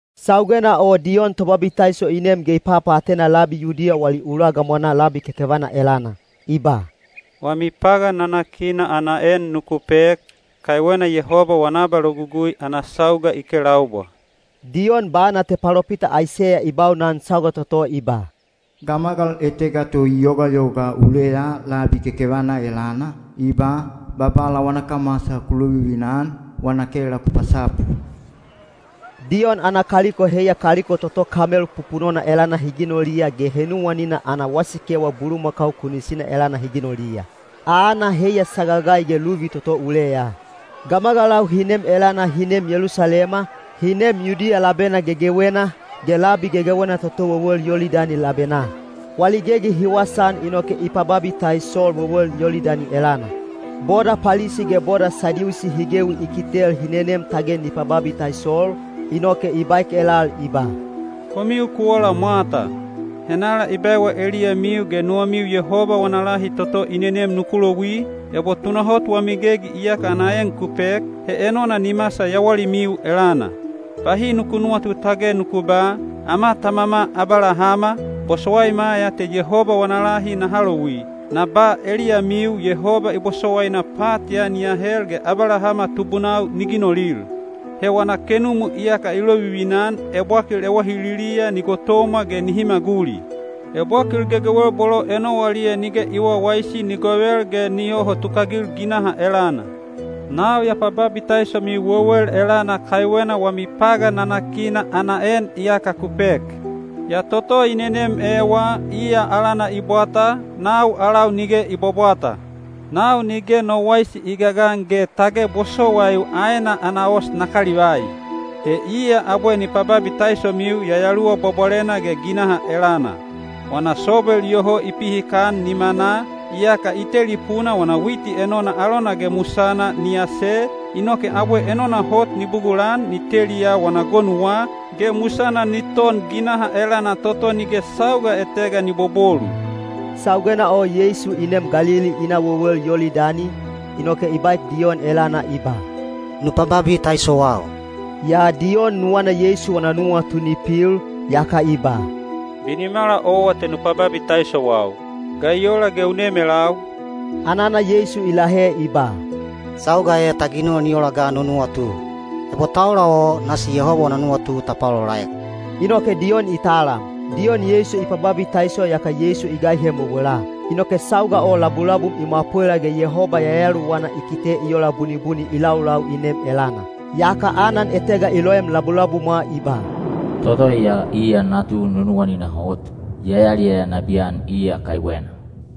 Saugena o Diyon Tobabitaiso i nem ge i papaatena labi Yudiya wali ula gamwanaa labi kekevana elana. I ba, “Wami pagan nanakina ana en nuku pek, kaiwena Yehoba wana abalogugui ana sauga i kelaubwa.” Diyon bana te palopita Aiseya i baunan sauga toto i ba: Gamagal etega to i yogayoga uleya labi kekevana elana, i ba, “Babala wana kamwasa ku lovivina-an, wana kela ku pasapu.” Diyon ana kaliko heiya kaliko toto kamel pupunona elana hi ginoliya ge henuwanina ana wasikewa bulumakau kunisina elana hi ginoliya. Aana heiya sagagai ge luvi toto uleya. Gamagalau hi nem elana hi neem Yelusalema, hi neem Yudiya labena gegewena, ge labi gegewena toto wewel Yolidani labenaa. Wali gegi hi wasaan inoke i pababitaisol wewel Yolidani elana. Boda Palisi ge boda Sadiusi hi gewi i kitel hi nenem tage ni pababitaisol, inoke i baek elal i ba, “Komiu ku ola mwata! Henala i baewa eliyamiu ge nuwamiu Yehoba wana lahi toto i nenem nuku louwi? Ebo tunahot wami gegi iyaka ana en ku pek, he enona ni masal yawalimiu elana. Bahi nuku nuwatu tage nuku ba, ‘Ama tamama Abalahama, bosowaima ya te Yehoba wana lahi naha louwi.’ Na ba eliyamiu Yehoba i bosowaina pat ya ni ahel ge Abalahama tubunau ni ginolil. He wana kenumu iyaka i lovivina-an ebwakil ewahililiya ni gotomwa ge nihi maguli. Ebwakil gegewel bolo enowaliya nige i wawaisi ni govel ge ni yoho tukagil ginaha elana. “Nau ya pababitaisomiu wewel elana kaiwena wami pagan nanakina ana en iyaka ku pek. Yaa toto i nenem ewa, iya alana i bwata, nau alau nige i bwabwata. Nau nige no waisi i gagan ge tage bosowaiu aena ana os na kalivai. He iya abwe ni pababitaisomiu Yayaluwa Bwabwalena ge ginaha elana. Wana sobel iyoho i pihikan nimanaa, yaka i tetelipuna wana witi enona alona ge musana ni ase, inoke abwe enona hot ni bugulan ni teliya wana gonuwa, ge musana ni ton ginaha elana toto nige sauga etega ni bobolu.” Saugena o Yeisu i neem Galili i na wewel Yolidani, inoke i baek Diyon elana i ba, “Nu pababitaisowau.” Yaa Diyon nuwana Yeisu wana nuwatu ni pil, yaka i ba, “Binimala owa te nu pababitaisowau. Ga i ola ge u nem elau?” Anana Yeisu i lahe i ba, “Sauga e ta ginol ni ola ga no nuwatu. Ebo ta ola o, nasi Yehoba wana nuwatu ta paolaolaek.” Inoke Diyon i talam. Diyon Yeisu i pababitaiso yaka Yeisu i gaihem wewela. Inoke sauga o labulabum i mwapwela ge Yehoba Yayaluwana i kite i ola bunibuni i laulau i nem elana. Yaka anan etega i loem labulabumwa i ba, “Toto ya iya natu nunuwanina hot; ya yaliyaya nabiyan iya kaiwena.”